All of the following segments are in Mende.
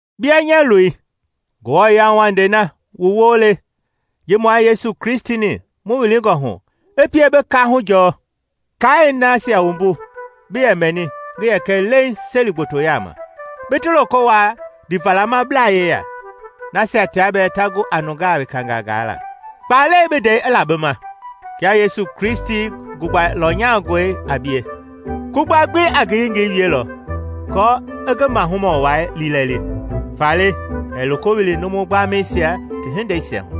Bia, nya loi, Ngewɔ yauwandei na mu woo le ji mua Yesu Kristi-ni mu wilingɔ hu i pie bi kaahu majɔɔ. Kaai nasia wumbu bi yɛ mɛni ngi yɛ kɛ leiŋ seli gboto yaama, bi ti loko wuaa ndiivalamablaa yeya, nasia tia bɛɛ ta gu a nungaa wekangaa gaala. Kpalɛi bi ndɛi i la bi ma, kia Yesu Kristi gugba lɔnyangɔi a bie. Kugba gbi a ngi yengei wielɔ aako i ngi mahumɔ wai liilɛli, faale ɛɛ loko wili numu gbamɛisia ti hindeisia hu.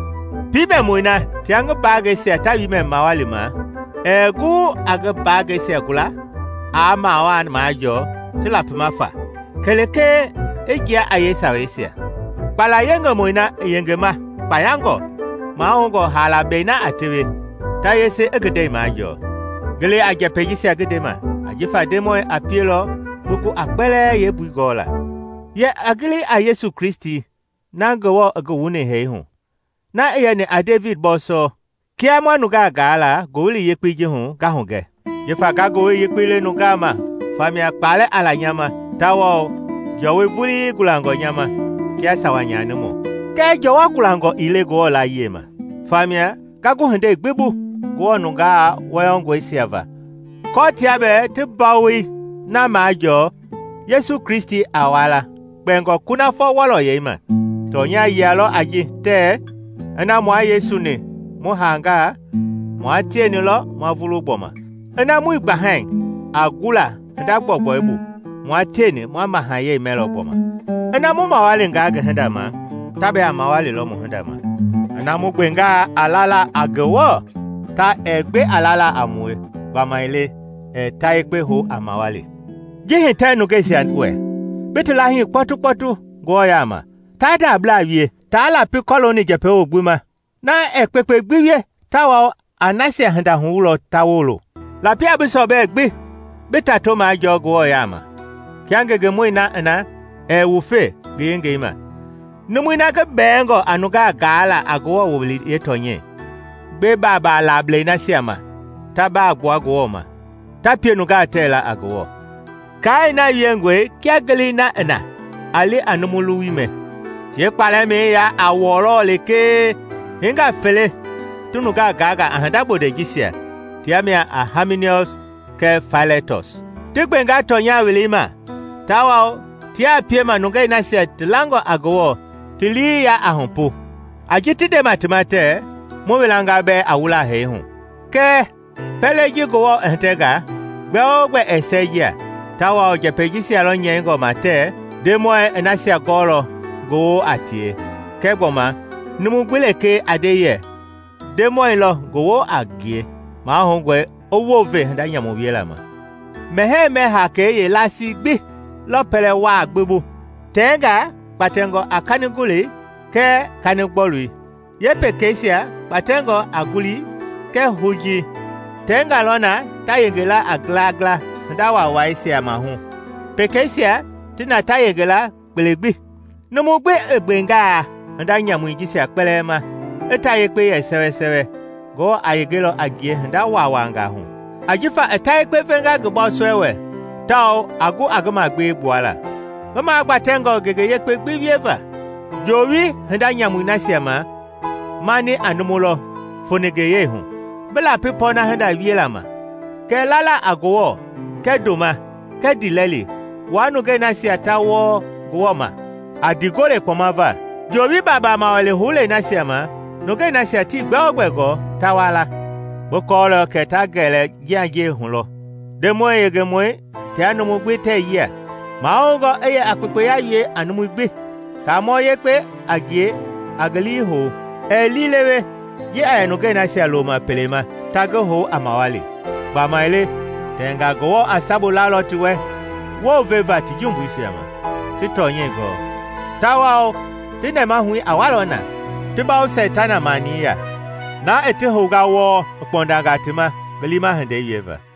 Piimɛmɔi na tia ngi mbaangɛisia ta wiimɛ mawali ma ɛɛ gu aa ngi mbaangɛisia gula aa mawaa na majɔɔ ti lapima faa kɛlee i jia a yee saweisia. Kpala yengemɔi na i yengema kpaayangɔ, mahoungɔ haala bei na ta tewe, ta yesei i ngi ndɛi majɔɔ. Gili a njɛpɛi jisia ngi ndema, ajifa Ndemɔi a pielɔ bi gu a kpɛlɛɛ yeembui gɔla. Yɛ a gili a Yesu Kristi na Ngewɔ i ngi wuni hee hu, na i yɛni a Devidi bɔɔsɔ, kia ma nungaa gaa la Ngowili Yekpei ji hu nga hugɛ, jifa nga Ngowili Yekpei le nungaa ma famia kpalɛ a la nya ma tawao jɔwɔi vulii gulangɔ nya ma kia sawa nyanimɔ. Kɛɛ jɔwɔ gulangɔ ii le Ngewɔ laayiɛi ma. Famia nga gu hindei gbi bu Ngewɔ nungaa wɔyɔngɔisia va kɔɔ tia bɛɛ ti mbawoi na majɔɔ Yesu Kristi a wala kpɛngɔ kunafɔ wɔlɔyɛi ma. Tɔnya yia lɔ a ji, tɛɛ: “Ina mua Yesu-ni mu haanga, mua tieni lɔ ma vulu gbɔma. Ina muii gbahai a gula hinda gbɔugbɔu bu, mua tieni ma mahayɛi mɛlɔ gbɔma. Ina mu mawalinga ngi hinda ma, ta bɛɛ a mawalilɔ mu hinda ma. Ina mu gbenga a lala a Ngewɔ, ta ɛɛ gbe a lala a mue gbamaile ɛɛ ta yekpe hou a mawali” Ji hitɛ nungeisia wɛ, bi ti laahii kpɔtukpɔtu Ngewɔ yaama taa ndabla wie, taa lapi kɔlooni njɛpɛwo gbi ma. Na ɛɛ kpekpe gbi wie tawao a nasia hinda huwulɔ ta wolo. Lapi a bi sɔbɛ gbi bi tato majɔɔ Ngewɔ yaama, kia ngengemɔi na i na ɛɛ wufe ngi yengei ma, numui na ngi bɛɛngɔ a nungaa gaala a Ngewɔ wowili yeetɔnyɛi. Gbe baabaa laablɛi nasia ma ta baa gbua Ngewɔ ma, ta pie nungaa tɛɛ la a Ngewɔ. Kaai na wiengɔe kia ngelei na i na a li a numu luwui mɛ, yeekpalɛmɛi ya a wɔlɔ lekee. Hingaa fele ti nungaa gaanga a hinda bondɛi jisia, tia mia a Haiminiɔs kɛɛ Failetɔs. Ti gbenga tɔnya welei ma tawao tiaa piema nungei nasia ti langɔ a Ngewɔ ti lii yaa a hupu, a ji ti ndema ti ma tɛɛ, mu welanga bɛɛ a wula hee hu. Kɛɛ pɛlei ji Ngewɔ i hitɛnga, gbɛ-o-gbɛ ɛɛ sɛɛjia; tawao njɛpɛi jisia lɔ nyɛingɔ ma tɛɛ, “Ndemɔi i nasia gɔɔlɔ ngi woo a tie”, kɛɛ gbɔma, “Numu gbi lekee a nde yɛ Ndemɔi lɔ ngi woo a ngie, mahoungɔ i wounve hinda nyamu wiela ma.” Mɛhɛɛ-mɛ haakei yeelasii gbi lɔ pɛlɛ waa gbi bu, tɛngaa gbatɛngɔ a kanigolei kɛɛ kanigbɔlui, pekeisia gbatɛngɔ a ngulii kɛɛ hujii; tɛɛnga lɔ na ta yenge la a ngila ngila hinda waawaisia mahu, pekeisia ti na ta yenge la kpele gbi. Numu gbi i gbengaa hinda nyamui jisia kpɛlɛɛ ma i ta yekpe yɛ sɛwɛ, Ngewɔ a yengelɔ a ngie hinda waawaangaa hu, ajifa i ta yekpe venga ngi bɔɔsɔi wɛ tawao a gu a ngi magbewe gbuala, ngi magbatɛngɔ ngenge yekpe gbi wieva. Joowi hinda nyamui nasia ma mani a numu lɔ foningeyɛi hu, bi lapi pɔɔna hinda wiela ma, kɛɛ lala a Ngewɔ, kɛɛ ndoma, kɛɛ ndiilɛli, wua nungei nasia ta wɔɔ Ngewɔ ma a ndiigole kpɔma va. Joowi baabaa mawali houlei nasia ma nungei nasia tii gbɛ-o-gbɛ gɔɔ ta wa la; bi kɔɔlɔ kɛ ta gɛlɛ njianjiɛi hu lɔ. Ndemɔi yengemɔi tia numu gbi tɛɛ yia. Mahoungɔ i yɛ a kpekpeya wie a numui gbi, Kaamɔ yekpe a ngie a ngi lii hou, Ɛɛ liilewe ji a yɛ nungei nasia loma pele ma ta ngi hou a mawali. Gbamaile tɛngaa Ngewɔ a sabu lalɔ ti wɛ wounveva ti jumbuisia ma ti tɔnyɛi gɔɔ. Tawao ti nɛmahui a walɔ na, ti bawo Seitana mani ya, na i ti hounga wɔɔ i kpɔndanga ti ma ngi liima hindei wieva.